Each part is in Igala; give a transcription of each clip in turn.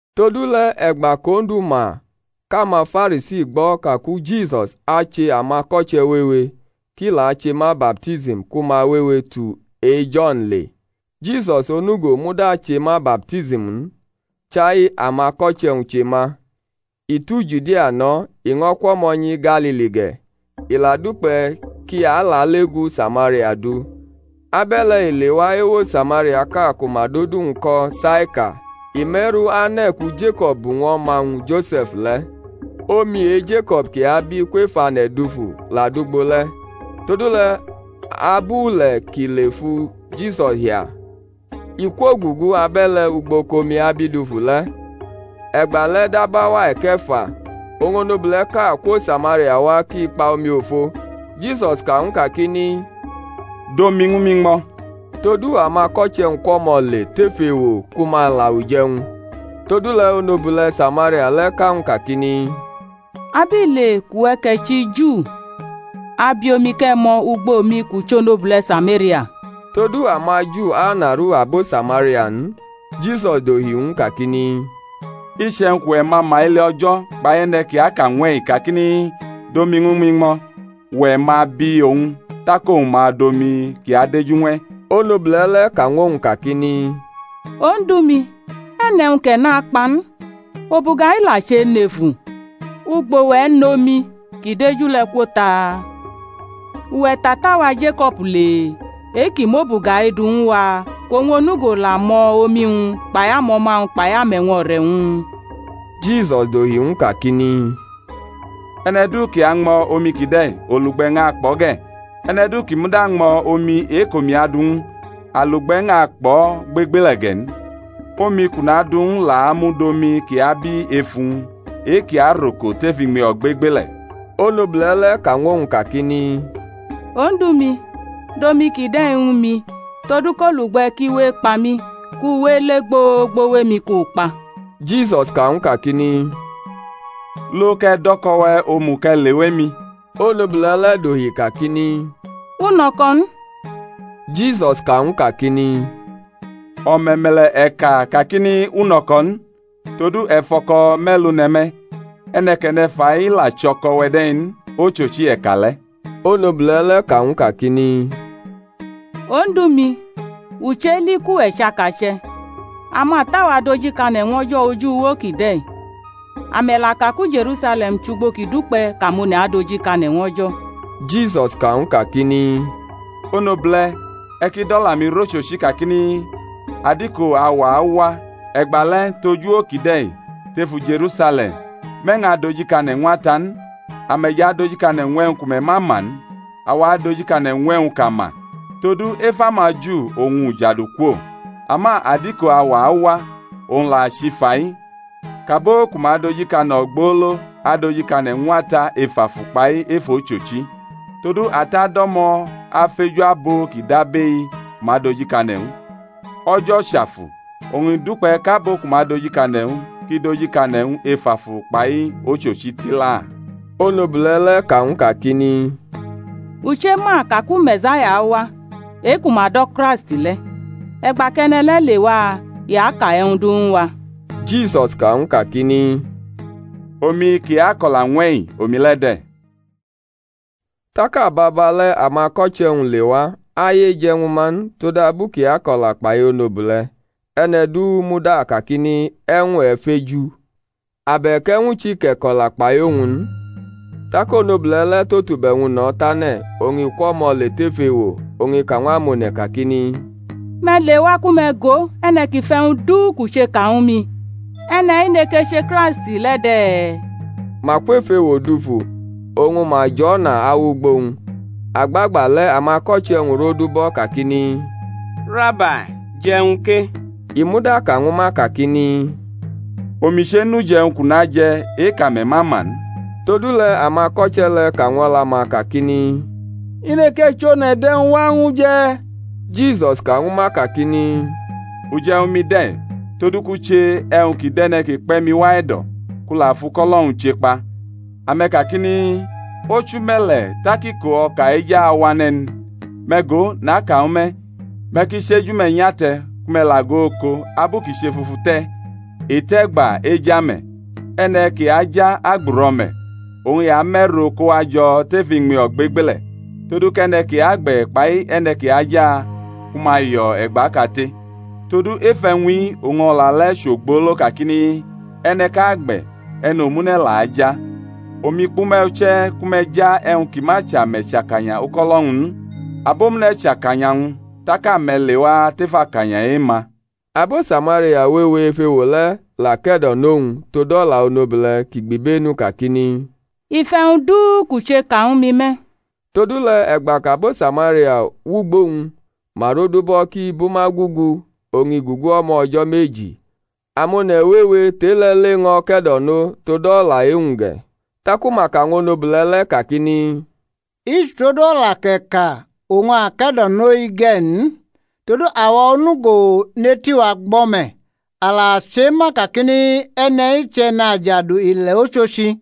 Todule̩ e̩gba kʼOndu ma kʼamaFarisi gbo̩ kaku Jisus ache amako̩che̩ wewe, kʼi la ache ma baptism ku ma wewe tu e-Jo̩n le (Jisus onugo muda che ma baptism n, chai amako̩che̩-wñ che ma), i tu Judia no̩, i ño̩ kwʼo̩mo̩ nyi Galili ge̩; i la dukpe̩ kʼi alale gu Samaria du. Abe̩le̩ i lewa ewo Samariaʼka ku ma dʼodu-wñ ko̩ Saikar; i me̩ru ane̩ ku Jeko̩b bu ñw o̩ma-wñ Jose̩f le̩. Omi e-Jeko̩b ki abi kwef ane̩ dufu la dʼugbo le̩. Todule̩ abu ule̩ kʼi le fu Jisus hia, i kwogugu abe̩le̩ ugbo kʼomi abi dufu le̩. E̩gbale̩ dab auwa e̩ke̩fa. Oñ i onobule̩ʼka kwo Samaria wa kʼi kpa omiofo. Jisus ka ñw u kakini, Dʼomi ñwu mi ñmo̩. Todu amako̩che̩-wñ kwʼo̩mo̩ le tef ewo ku ma la uje̩wñ. Todule̩ onobule̩ Samaria le̩ ka ñw u kakini, Abile kʼuwe̩ kʼe̩ chʼiJu abi omi kʼe̩ ñmo̩ ugbo mi kʼu chʼonobule̩ Samaria? (Todu amaJu anaru abo Samaria n.) Jisus dohi ñw u kakini, Iche̩wñ kʼuwe̩ ma ma ele O̩jo̩, kpai e̩ne̩ kʼi aka ñw e̩-i kakini, Dʼomi ñwu mi ñmo̩, uwe̩ ma bi owñ, tak owñ ma dʼomi ki adeju ñw e̩. Onobule̩ le̩ ka ñw u kakini, Odu-mi, e̩ nʼe̩wñ kʼe̩ nʼakpa n, obuga-i la chʼenefu; ugbo e̩ nʼomi ki deju le̩ kwo ta? Uwe̩ tʼata-wa Jeko̩b le? e-ki mʼobuga-i du ñwu wa, kʼowñ onugo la ñmo̩ omi-wñ, kpai amo̩ma-wñ kpai ame̩wño̩re̩-wñ? Jisus dohi ñw u kakini, E̩ne̩ du ki añmo̩ omi kide̩ olugbe̩ ñʼakpʼo̩ ge̩; e̩ne̩ du kʼi muda ñmo̩ omi e-kʼomi adu ñw u, alugbe̩ ñʼakpʼo̩ gbegbele̩ ge̩ n, omi kʼu nadu ñw u la amud omi ki abi efu-wñ e-ki aroko tef iñmi ogbegbele̩. Onobule̩ le̩ ka ñw owñ kakini, Odu-mi, dʼomi kide̩ ñwu mi, todu kʼalugbe̩ ki we ekpa mi, kʼu we ele gbogbo wʼemi kʼu kpa. Jisus ka ñw u kakini, Lo, kʼe̩ dʼo̩ko̩-we̩ omu, kʼe̩ lewa emi. Onobule̩ le̩ dohi kakini, U nʼo̩ko̩ n. Jisus ka ñw u kakini, O̩me̩me̩le̩ e̩ ka kakini, U nʼo̩ko̩ n; todu e̩ fʼo̩ko̩ me̩lu ne̩ me̩, e̩ne̩ kʼe̩ ne̩ fa-i i la chʼo̩ko̩-we̩ de̩ n; ochochi e̩ ka le̩. Onobule̩ le̩ ka ñw u kakini, Odu-mi, u cheli kʼuwe̩ chʼakache̩. Amata-wa dojikane̩ ñw O̩jo̩ oj uwo kide̩; ame̩ la ka ku Je̩rusale̩m chʼugbo ki dukpe̩ kʼamone̩ adojikane̩ ñw O̩jo̩. Jisus ka ñw u kakini, Onobule̩, e̩ ki dʼo̩la-mi rʼochochi kakini, Adiko auwa awa, e̩gba le̩ tʼoj uwo kide̩ tʼefu Je̩rusale̩m, me̩ ñʼadojikane̩ ñw Ata n. Ame̩ jʼadojikane̩ ñw e̩wñ ku me̩ ma ma n; awa adojikane̩ ñw e̩wñ kʼa ma; todu ef amaJu oñ ujadu kwo. Ama adiko auwa awa, owñ la chʼifa-i, kʼabo ku ma dojikane̩ ogbolo adojikane̩ ñw Ata ef afu kpai ef ochochi; todu Ata do̩mo̩ afeju abo ki dʼabʼe-i ku ma dojikane̩ ñw u. O̩jo̩ chʼAfu; oñ i dukpe̩ kʼabo ku ma dojikane̩ ñw u ki dojikane̩ ñw u ef afu kpai ochochi tila. Onobule̩ le̩ ka ñw u kakini, U chema ka ku Me̩saya awa (e-ku ma do̩ Kraisti le̩); e̩gba kʼe̩ne̩ le̩ lewa, i aka e̩wñ du ñwu wa. Jisus ka ñw u kakini, Omi, ki ako̩la ñw e̩-i, omi le̩ de̩. Tak ababa le̩ amako̩che̩-wñ lewa; aye je̩ ñwu ma n, todabu kʼi ako̩la kpai onobule̩; e̩ne̩ du muda kakini, E̩wñ e̩ feju? abe̩k e̩wñ chi kʼe̩ ko̩la kpai owñ? n. Tak onobule̩ le̩ tʼotube̩-wñ no̩ tane̩, oñ i kwʼo̩mo̩ le tef ewo, oñ i ka ñw amone̩ kakini, Me̩ lewa ku me̩ go e̩ne̩ ki fʼe̩wñ du kʼu che ka ñwu mi; e̩ne̩-i neke che Kraisti le̩ de̩? Ma kwʼef ewo dufu, oñ ma jʼo̩na awʼugbo-wñ. Agbagba le̩ amako̩che̩-wñ rodubʼo̩ kakini, Rabai, je̩ e̩wñ ke. I muda ka ñwu ma kakini, Omi chenʼuje̩wñ kʼu naje̩ e-kʼame̩ ma ma n. Todule̩ amako̩che̩ le̩ ka ñw o̩la-ma kakini, I neke chʼone̩ dʼe̩wñ wa ñw u je̩? Jisus ka ñwu ma kakini, Uje̩wñ-mi de̩: todu kʼu che e̩wñ ki dʼe̩ne̩ ki kpe̩ mi wa e̩do̩, kʼu la fʼuko̩lo̩-wñ chekpa. Ame̩ kakini, Ochu me̩le̩ tak iko o̩ka e̩ja awane̩ n? Me̩ go, naka ñwu me̩, me̩ ki chi eju-me̩ nyʼate̩ ku me̩ la go oko, abu kʼi chefufu te̩, i tʼe̩gba e̩ja me̩. E̩ne̩ ki aja agbʼuro̩me̩, oñ i amʼe̩ro kowa jo̩ tef iñmi o̩gbegbele̩; todu kʼe̩ne̩ ki agbe̩ kpai e̩ne̩ ki aja ku ma yo̩ e̩gba kate. Todu ef e̩wñ-i oñ o̩la le̩ chʼogbolo kakini, E̩ne̩ʼka agbe̩; e̩ne̩ omune̩ la aja. Omi kpʼume̩ uche̩ ku me̩ ja e̩wñ ki ma chʼame̩ chʼakanya uko̩lo̩-wñ n; abomune̩ chʼakanya wñ tak ame̩ lewa tef akanya e-ma. Abo Samaria wewe ef ewo le̩ la ke̩do̩nʼowñ tod o̩la onobule̩ ki gbʼibenu kakini, I fʼe̩wñ du kʼu che ka ñwu mi me̩. Todule̩ e̩gba kʼabo Samaria wʼugbo wñ, ma rodubʼo̩ kʼi bʼuma gugu; oñ i gugu o̩mo̩ o̩jo̩ meji. Amone̩ wewe tʼe-le̩ le ño̩ ke̩do̩no tod o̩la e-wñ ge̩, taku ma ka ñw onobule̩ le̩ kakini, I chʼutod o̩la kʼe̩ ka oñ a ke̩do̩no-i ge̩ n; todu awa onugo nʼeti-wa gbo̩ me̩, a la chema kakini, E̩ne̩-i chʼE̩najadu ile̩ ochochi.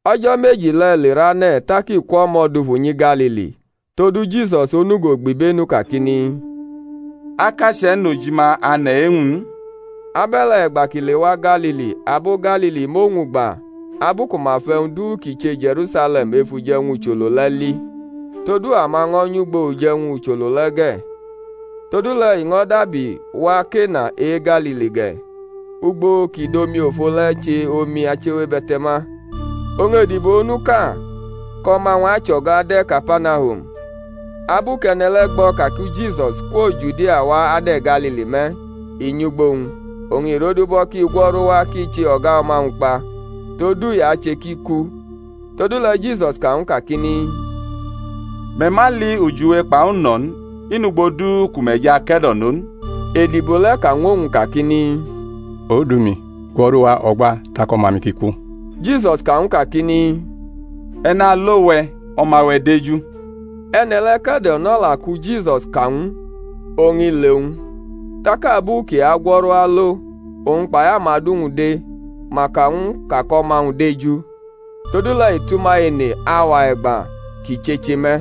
O̩jo̩ meji le̩ lerane̩ tak i kwʼo̩mo̩ dufu nyi Galili. Todu Jisus onugo gbʼibenu kakini, Akache̩ nʼojima ane̩ e-wñ n. Abe̩le̩ e̩gba kʼi lewa Galili, abo Galili mʼowñ gba abu ku ma fʼe̩wñ du kʼi che Je̩rusale̩m ef uje̩wñ ucholo le̩ li; todu ama ño̩ nyʼugbo uje̩wñ ucholo le̩ ge̩. Todule̩ i ño̩ dabi wa Kena e-Galili ge̩, ugbo kʼi dʼomiofo le̩ che omi achiwebe̩te̩ma. Oñ edibo onuʼka kʼo̩ma-wñ achʼo̩ga de̩ Kapanahum. Abu kʼe̩ne̩ le̩ gbo̩ ka ku Jisus kwo Judia wa ane̩ Galili me̩, i nyʼugbo wñ, oñ i rodubʼo̩ kʼi gwo̩ru wa kʼi che o̩ga o̩ma-wñ kpa; todu i ache kʼi ku. Todule̩ Jisus ka ñw u kakini, Me̩ ma li ujiwe kpai uno̩ n, i nʼugbo du ku me̩ jʼake̩do̩no n. Edibo le̩ ka ñw owñ kakini, Odu-mi, gwo̩ru wa o̩gba tak o̩ma-mi ki ku. Jisus ka ñw u kakini, E̩ nalo we̩, o̩ma-we̩ deju. E̩ne̩ le̩ ke̩do̩nʼo̩la ku Jisus ka ñw u, oñ i le wñ. Tak abu kʼi agwo̩ru alo, owñ kpai amadu-wñ de, ma ka ñw u kakʼo̩ma-wñ deju. Todule̩ i tʼuma ene auwa e̩gba kʼi checheme̩.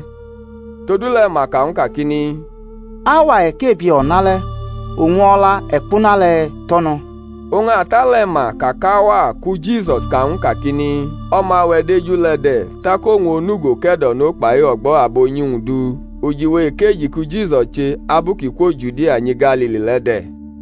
Todule̩ ma ka ñw u kakini, Auwa e̩kebie o̩nale̩ oñ o̩la-e̩kpuna le̩ tʼo̩ no̩. Oñ ata le̩ ma ka kʼauwa ku Jisus ka ñw u kakini, O̩ma-we̩ deju, le̩ de̩; tak owñ onugo ke̩do̩no kpai o̩gbo̩ abunyi-wñ du. Ujiwe ekeji ki Jisus che abu kʼi kwo Judia nyi Galili le̩ de̩.